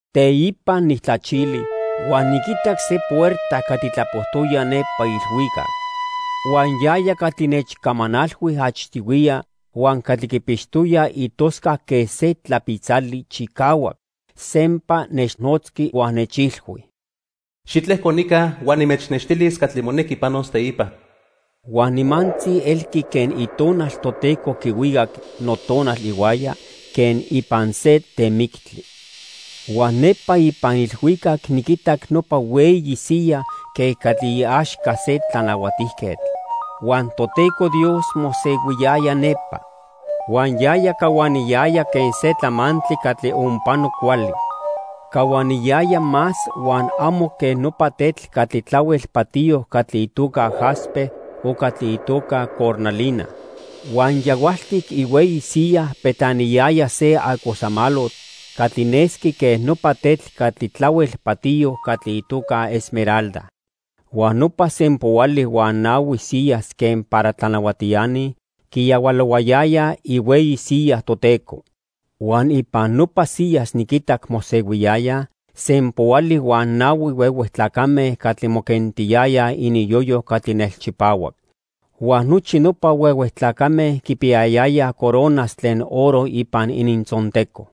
Teipa nijtlachili huan niquitac se puerta catli tlapojtoya nepa ilhuicac. Huan yaya catli nechcamanalhui achtihuiya huan catli quipixtoya itoscac quen se tlapitzali chicahuac, sempa nechnotzqui huan nechilhui: "Xitlejco nica huan nimechnextilis catli monequi panos teipa." Huan nimantzi elqui quen Itonal Toteco quihuicac notonal ihuaya quen ipan se temictli. Huan nepa ipan ilhuicac niquitac nopa hueyi siya quen catli iaxca se tlanahuatijquetl, huan Toteco Dios mosehuiyaya nepa. Huan yaya cahuaniyaya quen se tlamantli catli onpano cuajcuali. Cahuaniyaya más huan amo quen nopa tetl catli tlahuel patiyo catli itoca jaspe o catli itoca cornalina. Huan yahualtic ihueyi siyaj petlaniyaya se acosamalotl catli nesqui quen nopa tetl catli tlahuel patiyo catli itoca esmeralda. Huan nopa sempoali huan nahui siyas quen para tlanahuatiani quiyahualohuayayaj ihueyi siya Toteco. Huan ipan nopa siyas niquinitac mosehuiyayaj sempoali huan nahui huehue tlacame catli moquentiyayaj ininyoyo catli nelchipahuac. Huan nochi nopa huehue tlacame quipiyayayaj coronas tlen oro ipan inintzonteco.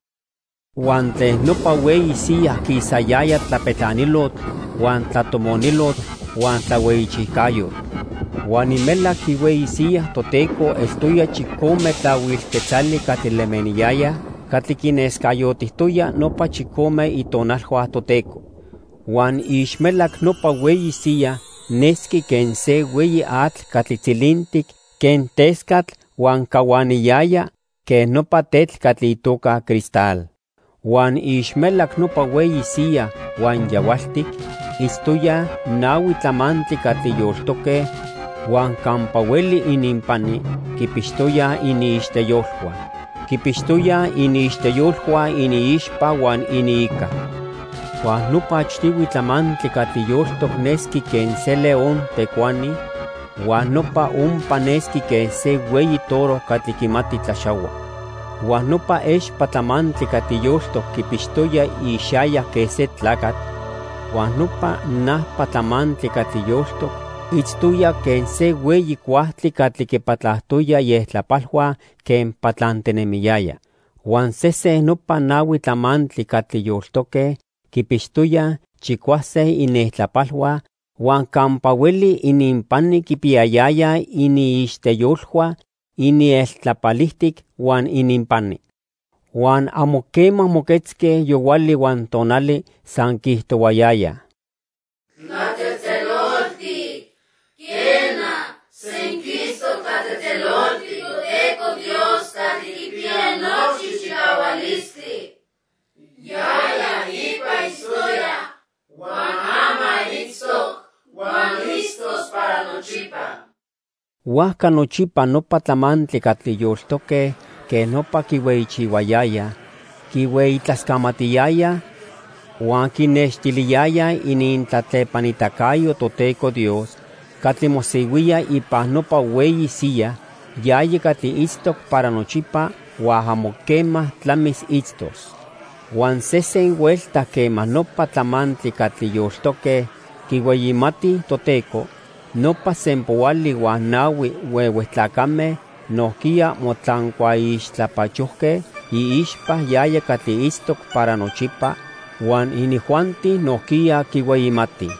Huan tlen nopa hueyi siya quisayaya tlapetlanilotl huan tlatomonilotl huan tlahuejchijcayotl. Huan imelac ihueyi siyaj Toteco eltoya chicome tlahuil quetzali catli lemeniyayaj catli quinescayotijtoya nopa chicome itonalhua Toteco. Huan iixmelac nopa hueyi siya nesqui quen se hueyi atl catli tzilintic quen tescatl huan cahuaniyaya quen nopa tetl catli itoca cristal. Huan iixmelac nopa hueyi siya huan yahualtic itztoyaj nahui tlamantli catli yoltoque huan campa hueli ininpani quipixtoyaj iniixteyolhua. Quipixtoyaj iniixteyolhua iniixpa huan iniica. Huan nopa achtihui tlamantli catli yoltoc nesqui quen se león tecuani huan nopa ompa nesqui quen se hueyi toro catli quimati tlaxahua. Huan nopa expa tlamantli catli yoltoc quipixtoya ixayac quen se tlacatl, huan nopa najpa tlamantli catli yoltoc itztoya quen se hueyi cuajtli catli quipatlajtoya ieltlapalhua quen patlantinemiyaya. Huan sesen nopa nahui tlamantli catli yoltoque quipixtoyaj chicuase inieltlapalhua huan campa hueli ininpani quipiyayayaj iniixteyolhua inieltlapalijtic huan ininpani. Huan amo quema moquetzque yohuali huan tonali, san quiijtohuayayaj: "Tlatzejtzeloltic, quena, senquistoc tlatzejtzeloltic Toteco Dios Catli Quipiya Nochi Chicahualistli. Yaya ipa itztoya, huan ama itztoc, huan itztos para nochipa." Huajca nochipa nopa tlamantli catli yoltoque quej nopa quihueyichihuayayaj, quihueyitlascamatiyayaj huan quinextiliyayaj inintlatlepanitacayo Toteco Dios catli mosehuía ipan nopa hueyi siyaj, yaya catli itztoc para nochipa huan amo quema tlamis itztos. Huan sesen huelta quema nopa tlamantli catli yoltoque quihueyimatij Toteco, nopa sempoali huan nahui huehue tlacame nojquiya motlancuaixtlapachojque iixpa yaya catli itztoc para nochipa, huan inijuanti nojquiya quihueyimatij.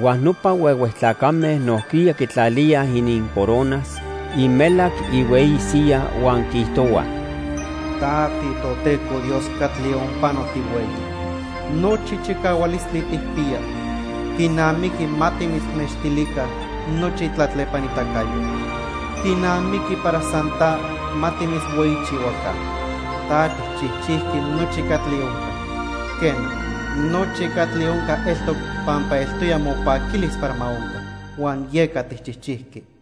Huan nopa huehue tlacame nojquiya quitlalíaj inincoronas imelac ihueyi siya huan quiijtohuaj: "Ta tiToteco Dios catli onpano tihueyi. Nochi chicahualistli tijpiya. Quinamiqui ma timitznextilica nochi tlatlepanitacayotl. Quinamiqui para san ta ma timitzhueyichihuaca. Ta tijchijchijqui nochi catli onca. Quena, nochi catli onca eltoc pampa eltoya mopaquilis para ma onca, huan yeca tijchijchijqui."